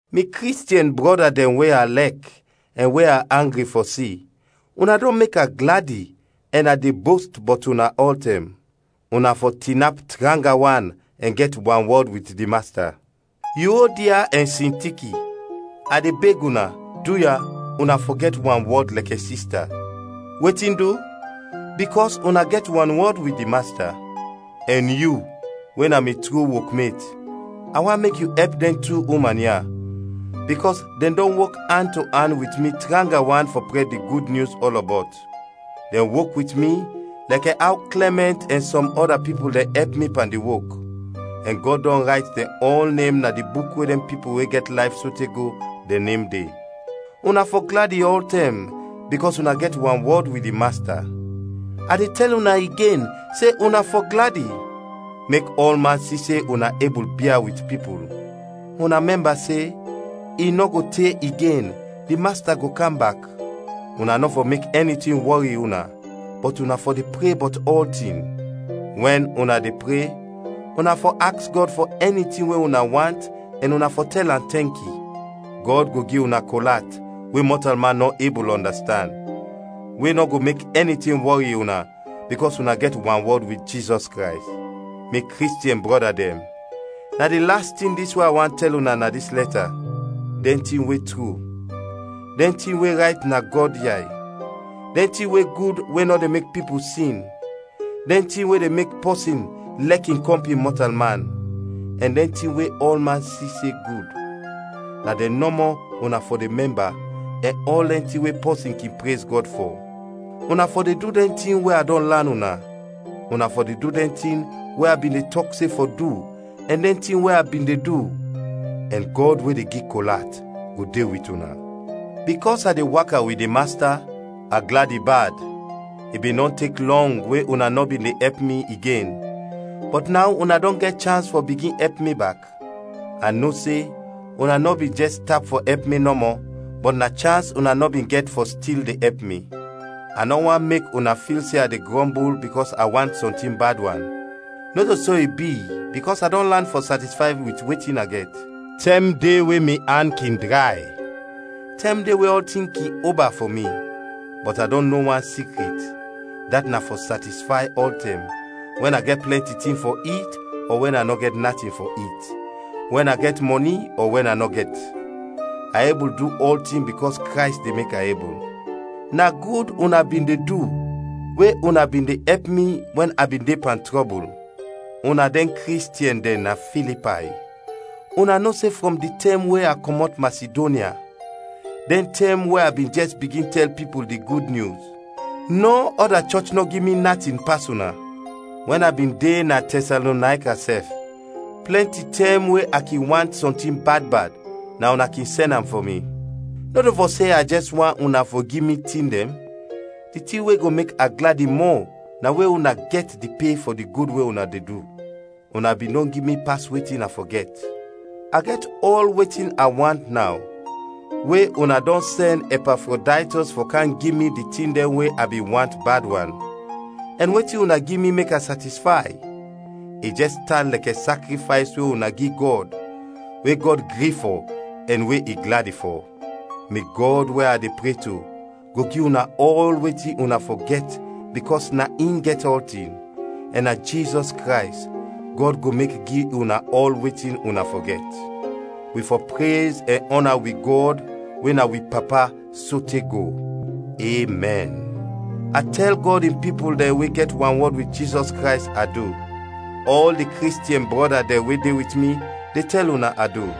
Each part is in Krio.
Mi Kristiɛn brɔda dɛn we a lɛk ɛn we a angri fɔ si, una dɔn mek a gladi ɛn a de bost bɔt una ɔltɛm. Una fɔ tinap tranga wan ɛn gɛt wanwɔd wit di Masta. Yuodia ɛn Sintiki, a de beg una, duya, una fɔ gɛt wanwɔd lɛkɛ sista. Wetin du? Bikɔs una gɛt wanwɔd wit di Masta. Ɛn yu, we na mi tru wokmet, a want mek yu ɛp dɛn tu uman ya, bikɔs dɛn dɔn wok an to an wit mi tranga wan fɔ prɛd di Gud Nyus ɔlɔbɔt. Dɛn wok wit mi lɛkɛ aw Klɛmɛnt ɛn sɔm ɔda pipul dɛn ɛp mi pan di wok, ɛn Gɔd dɔn rayt dɛn ɔl nem na di buk we dɛn pipul we gɛt layf sote go dɛn nem de. Una fɔ gladi ɔltɛm bikɔs una gɛt wanwɔd wit di Masta. A de tɛl una igen se una fɔ gladi! Mek ɔlman si se una ebul bia wit pipul. Una mɛmba se, i nɔ go te igen, di Masta go kam bak. Una nɔ fɔ mek ɛni tin wɔri una, bɔt una fɔ de pre bɔt ɔltin. Wɛn una de pre, una fɔ aks Gɔd fɔ ɛni tin we una want ɛn una fɔ tɛl am tɛnki. Gɔd go gi una kol at, we mɔtalman nɔ ebul ɔndastand, we nɔ go mek ɛni tin wɔri una, bikɔs una gɛt wanwɔd wit Jizɔs Krays. Mi Kristiɛn brɔda dɛn, na di las tin dis we a want tɛl una na dis lɛta: dɛn tin we tru, dɛn tin we rayt na Gɔd yay, dɛn tin we gud we nɔ de mek pipul sin, dɛn tin we de mek pɔsin lɛk in kɔmpin mɔtalman, ɛn dɛn tin we ɔlman si se gud; na dɛn nɔmɔ una fɔ de mɛmba ɛn ɔl dɛn tin we pɔsin kin prez Gɔd fɔ. Una fɔ de du dɛn tin we a dɔn lan una. Una fɔ de du dɛn tin we a bin de tɔk se fɔ du ɛn dɛn tin we a bin de du. Ɛn Gɔd we de gi kol at go de wit una. Bikɔs a de waka wit di Masta, a gladi bad. I bin dɔn tek lɔng we una nɔ bin de ɛp mi igen, bɔt naw una dɔn gɛt chans fɔ bigin ɛp mi bak. A no se una nɔ bin jɛs tap fɔ ɛp mi nɔmɔ, bɔt na chans una nɔ bin gɛt fɔ stil de ɛp mi. A nɔ want mek una fil se a de grɔmbul bikɔs a want sɔntin bad wan, nɔto so i bi bikɔs a dɔn lan fɔ satisfay wit wetin a gɛt. Tɛm de we mi an kin dray, tɛm de we ɔltin kin oba fɔ mi. Bɔt a dɔn no wan sikrit, dat na fɔ satisfay ɔltɛm, wɛn a gɛt plɛnti tin fɔ it ɔ wɛn a nɔ gɛt natin fɔ it, wɛn a gɛt mɔni ɔ wɛn a nɔ gɛt. A ebul du ɔltin bikɔs Krays de mek a ebul. Na gud una bin de du we una bin de ɛp mi wɛn a bin de pan trɔbul. Una dɛn Kristiɛn dɛn na Filipay, una no se frɔm di tɛm we a kɔmɔt Masidonya, dɛn tɛm we a bin jɛs bigin tɛl pipul di Gud Nyus, nɔ ɔda chɔch nɔ gi mi natin pas una. Wɛn a bin de na Tɛsalonayka sɛf, plɛnti tɛm we a kin want sɔntin bad bad, na una kin sɛn am fɔ mi. Nɔto fɔ se a jɛs want una fɔ gi mi tin dɛn, di tin we go mek a gladi mɔ na we una go gɛt di pe fɔ di gud we una de du. Una bin dɔn gi mi pas wetin a fɔ gɛt; a gɛt ɔl wetin a want naw we una dɔn sɛn Ɛpafrodaytɔs fɔ kam gi mi di tin dɛn we a bin want bad wan, ɛn wetin una gi mi mek a satisfay, i jɛs tan lɛkɛ sakrifays we una gi Gɔd we Gɔd gri fɔ ɛn we i gladi fɔ. Mi Gɔd we a de pre to, go gi una ɔl wetin una fɔ gɛt bikɔs na in gɛt ɔltin, ɛn na Jizɔs Krays, Gɔd go mek gi una ɔl wetin una fɔ gɛt. Wi fɔ prez ɛn ɔna wi Gɔd we na wi Papa sote go! Emɛn. A tɛl Gɔd in pipul dɛn we gɛt wanwɔd wit Jizɔs Krays, adu. Ɔl di Kristiɛn brɔda dɛn we de wit mi, de tɛl una adu.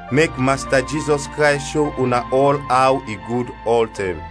Mek Masta Jizɔs Krays sho una ɔl aw i gud ɔltɛm.